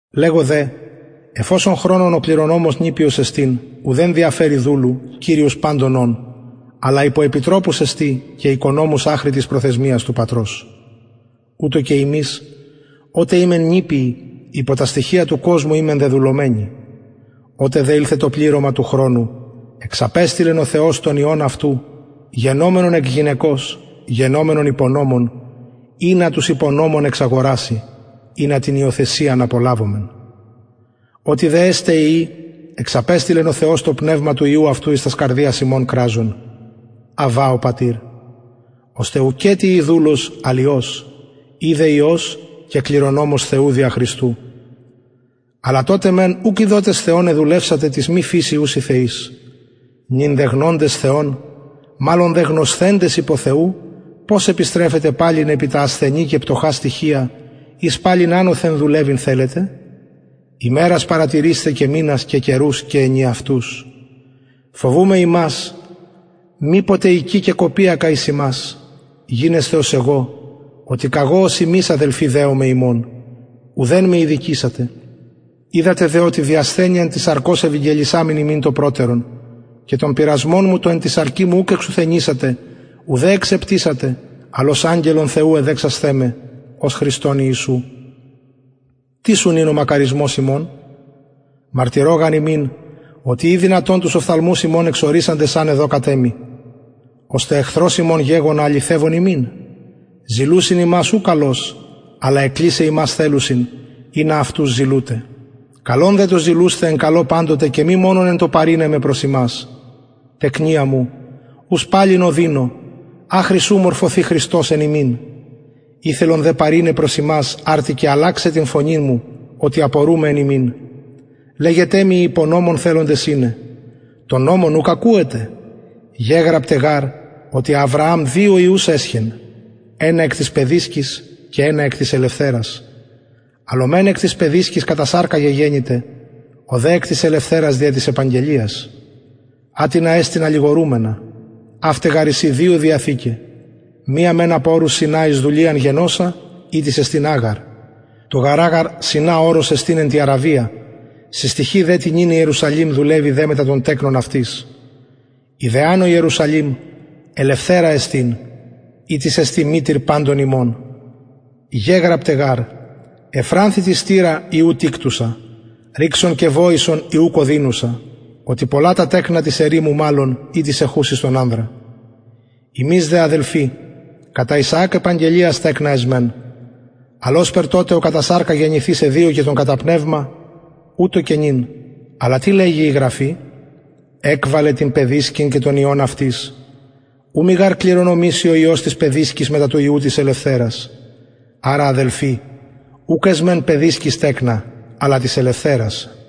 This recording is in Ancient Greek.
λεγω δε εφ οσον χρονον ο κληρονομος νηπιος εστιν ουδεν διαφερει δουλου κυριος παντων ων αλλα υπο επιτροπους εστιν και οικονομους αχρι της προθεσμιας του πατρος ουτως και ημεις οτε ημεν νηπιοι υπο τα στοιχεια του κοσμου ημεν δεδουλωμενοι οτε δε ηλθεν το πληρωμα του χρονου εξαπεστειλεν ο θεος τον υιον αυτου γενομενον εκ γυναικος γενομενον υπο νομον ινα τους υπο νομον εξαγοραση ινα την υιοθεσιαν απολαβωμεν οτι δε εστε υιοι εξαπεστειλεν ο θεος το πνευμα του υιου αυτου εις τας καρδιας υμων κραζον αββα ο πατηρ ωστε ουκετι ει δουλος αλλ υιος ει δε υιος και κληρονομος θεου δια χριστου αλλα τοτε μεν ουκ ειδοτες θεον εδουλευσατε τοις μη φυσει ουσιν θεοις νυν δε γνοντες θεον μαλλον δε γνωσθεντες υπο θεου πως επιστρεφετε παλιν επι τα ασθενη και πτωχα στοιχεια οις παλιν ανωθεν δουλευειν θελετε ημερας παρατηρεισθε και μηνας και καιρους και ενιαυτους φοβουμαι υμας μηπως εικη κεκοπιακα εις υμας γινεσθε ως εγω οτι καγω ως υμεις αδελφοι δεομαι υμων ουδεν με ηδικησατε οιδατε δε οτι δι ασθενειαν της σαρκος ευηγγελισαμην υμιν το προτερον και τον πειρασμον μου τον εν τη σαρκι μου ουκ εξουθενησατε ουδε εξεπτυσατε αλλ ως αγγελον θεου εδεξασθε με ως χριστον ιησουν τις ουν ην ο μακαρισμος υμων μαρτυρω γαρ υμιν οτι ει δυνατον τους οφθαλμους υμων εξορυξαντες αν εδωκατε μοι ωστε εχθρος υμων γεγονα αληθευων υμιν ζηλουσιν υμας ου καλως αλλα εκκλεισαι υμας θελουσιν ινα αυτους ζηλουτε καλον δε το ζηλουσθαι εν καλω παντοτε και μη μονον εν τω παρειναι με προς υμας τεκνια μου ους παλιν ωδινω αχρι ου μορφωθη χριστος εν υμιν ηθελον δε παρειναι προς υμας αρτι και αλλαξαι την φωνην μου οτι απορουμαι εν υμιν λεγετε μοι οι υπο νομον θελοντες ειναι τον νομον ουκ ακουετε γεγραπται γαρ οτι αβρααμ δυο υιους εσχεν ενα εκ της παιδισκης και ενα εκ της ελευθερας αλλ ο μεν εκ της παιδισκης κατα σαρκα γεγεννηται ο δε εκ της ελευθερας δια της επαγγελιας ατινα εστιν αλληγορουμενα αυται γαρ εισιν δυο διαθηκαι μια μεν απο ορους σινα εις δουλειαν γεννωσα ητις εστιν αγαρ το γαρ αγαρ σινα ορος εστιν εν τη αραβια συστοιχει δε τη νυν ιερουσαλημ δουλευει δε μετα των τεκνων αυτης η δε ανω ιερουσαλημ ελευθερα εστιν ητις εστιν μητηρ παντων ημων γεγραπται γαρ ευφρανθητι στειρα η ου τικτουσα ρηξον και βοησον η ουκ ωδινουσα οτι πολλα τα τεκνα της ερημου μαλλον η της εχουσης τον ανδρα ημεις δε αδελφοι κατα ισαακ επαγγελιας τεκνα εσμεν αλλ ωσπερ τοτε ο κατα σαρκα γεννηθεις εδιωκεν τον κατα πνευμα ουτως και νυν αλλα τι λεγει η γραφη εκβαλε την παιδισκην και τον υιον αυτης ου γαρ μη κληρονομηση ο υιος της παιδισκης μετα του υιου της ελευθερας αρα αδελφοι ουκ εσμεν παιδισκης τεκνα αλλα της ελευθερας